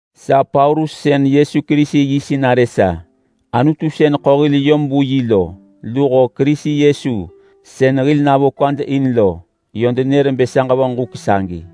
Sa Paulus sën Yesu Kerisi yi sinarë sa. Anutu sën ḳo hil yom vu yi lo luho Kerisi Yesu sën hil navo kwad in lo, yö denër bë sa ġevonġ huk sagi.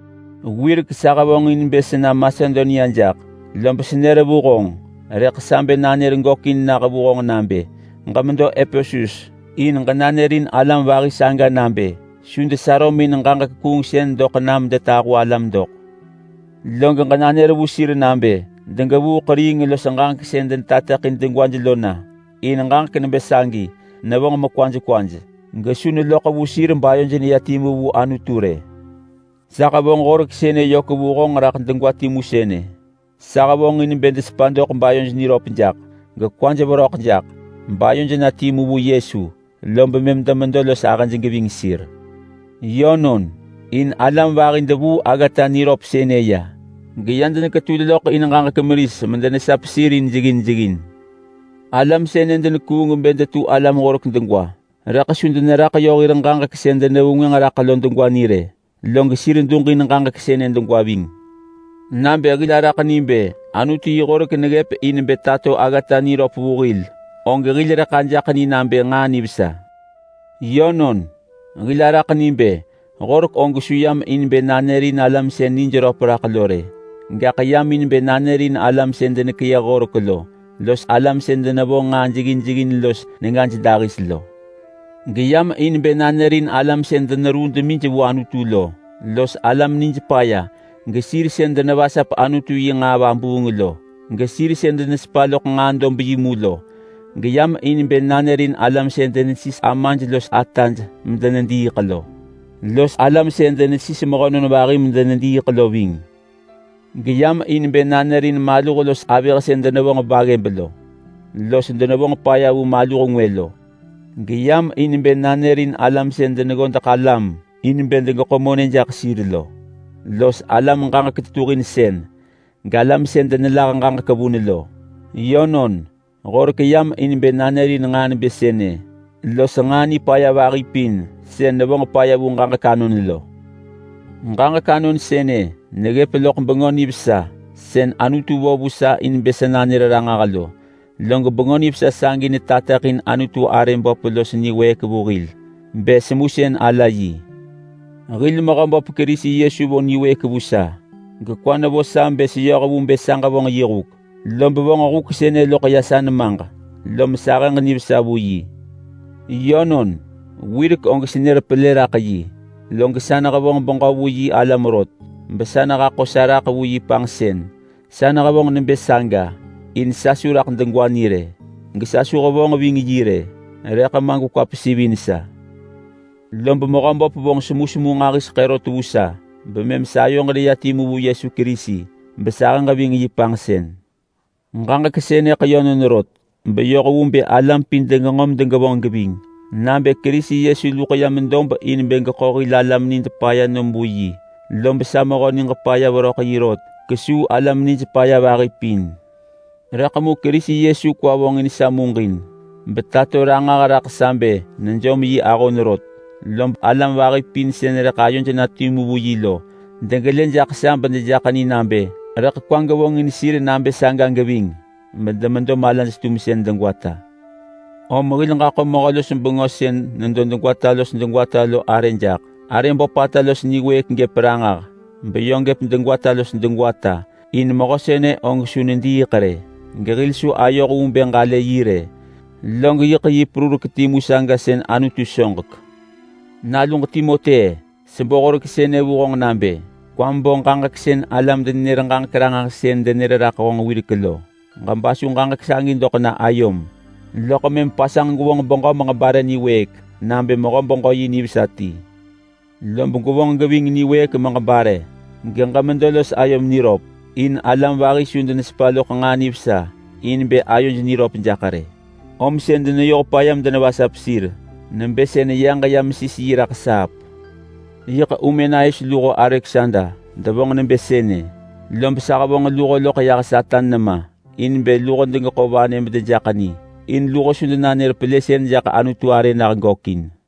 Wirek sa hevonġin bë sena Masedonia jaḳ, lob senër vu honġ, rëḳ sa bë nanër gökin nah vu honġ nabë: Ġemedo Epesus in ġenanërin alam vahi saga nabë su desarömin ġaġek kuungsën doḳ na medetahu alam doḳ. Log ġenanër vu sir nabë degevuu ḳeriing los ġaġek sën denetateḳin degwaj lo na, in ġaġek nebë sagi nevonġ mekwaj kwaj. Gaḳ su neloḳ vu sir bayoj neya timu vu Anutu rë. Sa hevonġ horek sënë yök vu honġ raḳ degwa timu sënë: Sa hevonġin bë desepa doḳ bayoj niröp jaḳ gekwaj veröḳ jaḳ bayoj na timu vu Yesu, lob mëm demedo los ahëj geving sir. Yönon, in alam vahi devuu aggata niröp sënë ya, geya deneketul loḳ in ġaġek meris medenesap sir in jeggin jeggin. Alam sënë denekuung bë detu alam horek degwa. Rëḳ su deneraḳ yö hir ġaġek sën denevengwënġ raḳ lo degwa ni rë, log sir duġin ġaġek sënë degwa ving. Nabë hil ġalë Anutu yi horek niröp nabë neggëp in bë tato aggata niröp vu hil, og hil rëḳ ajaḳ ni nabë nġaa nivesa. Yönon, hil araḳ ni bë horek og su yam in bë nanërin alam sën nijröp raḳ lo rë, gaḳ yam in bë nanërin alam sën denekeyëh horek lo, los alam sën denevonġ nġaa jeggin jeggin los nengaj dahis lo. Geyam in bë nanërin alam sën deneruu demij vu Anutu lo, los alam nij paya, gesir sën denevasap Anutu yi nġaa vabuung lo, gesir sën denesepa loḳ nġaa dob yi mu lo; geyam in bë nanërin alam sën denesis amaj los ataj medenediiḳ lo, los alam sën denesis mehönon vahi medenediiḳ lo ving. Geyam in bë nanërin maluh los avëh sën denevonġ baggëb lo los denevonġ paya vu maluh ngwë lo. Geyam in bë nanërin alam sën deneggodeḳ alam in bë degeḳo monë jaḳ sir lo, los alam ġaġek tetuhin sën, galam sën denelah ġaġek vun lo. Yönon, horek yam in bë nanërin nġaa nebë sënë los nġaa nipaya vahi pin sën nevonġ paya vu ġaġek anon lo. Ġaġek anon sënë neggëp loḳ Bengö Nivesa sën Anutu vo vu sa in bë sa nanër ranġah lo, log Bengö Nivesa sagi netateḳin Anutu arë böp los niwëëk vu hil bë semusën ala yi. Hil Mehöböp Kerisi Yesu vo niwëëk vu sa, gekwa nevo sa bë seyoh vu bë sa ġevonġ yi huk, lob vonġ huk sënë loḳ ya sa nemaġ, lom sa ahëġ nivesa vu yi. Yönon, wirek og senër pelë raḳ yi, log sa nehevonġ beġö vu yi alam rot gesa nehaḳo sa raḳ vu yi panġsën. Sa nehevonġ nebë saga in sa su raḳ degwa ni rë, gesa su hevonġ ving yi rë, rëḳ ma gekwa pesivin sa. Lob Mehöböp vonġ semusemu nġahiseḳë rot vu sa, bemëm sayoġ neya timu vu Yesu Kerisi, besahëġ ving yi panġsën. Ġaġek sënëḳ yönon rot, beyoh vu bë alam pin degenġo medegevonġ geving nabë Kerisi Yesu luḳ yam dob in bë geḳo hil alam nid paya nom vu yi. Lob sa mehö niġ paya veröḳ yi rot kesuu alam nij paya vahi pin. Rëḳ mu Kerisi Yesu kwa vonġin sa muġin betato ranġah raḳ sa bë nejom yi ahon rot. Lob alam vahi pin sën rëḳ ayoj na timu vu yi lo degelë jaḳ sa bedejaḳ ni nabë rëḳ kwa gevonġin sir nabë saga geving, bedemedo malaj-tumsën degwata. Om hil ġaḳo mehö-los-bengö sën nedo degwata los degwata lo arë jaḳ. Arë böpata los niwëëk gëp ranġah beyö gëp degwata los degwata, in mehö sënë og su nediiḳ rë, gehil su ayoh vu bë ġalë yi rë, log yiḳ yi perurek timu saga sën Anutu soġek. Naluġ Timoti-e! Sebo horek sënë vu honġ nabë: Kwam bo ġaġek sën alam-denenër-ġaġek-ranġahsën denër raḳ honġ wirek lo. Ġebasu ġaġek sagi doḳ na ayom, loḳ mëm pasanġ gwevonġ beġö meġebare niwëëk nabë mehö-beġö-yi nivesa ti. Lob gwevonġ geving niwëëk meġebare, geġemedo los ayom niröp. In alam vahi su denesepa loḳ nġaa nivesa in bë ayoj niröp jaḳ rë, om sën deneyoh paya medevasap sir nebë sën yaġ ya mesis yi raḳ saap. Yiḳ Humenaius luho Aleksander devonġ nebë sënë, lob sa hevonġ luho loḳ yah Satan nema in bë luho degeḳo vanë medejaḳ ni, in luho su denanër pelësën jaḳ Anutu arë nah gökin.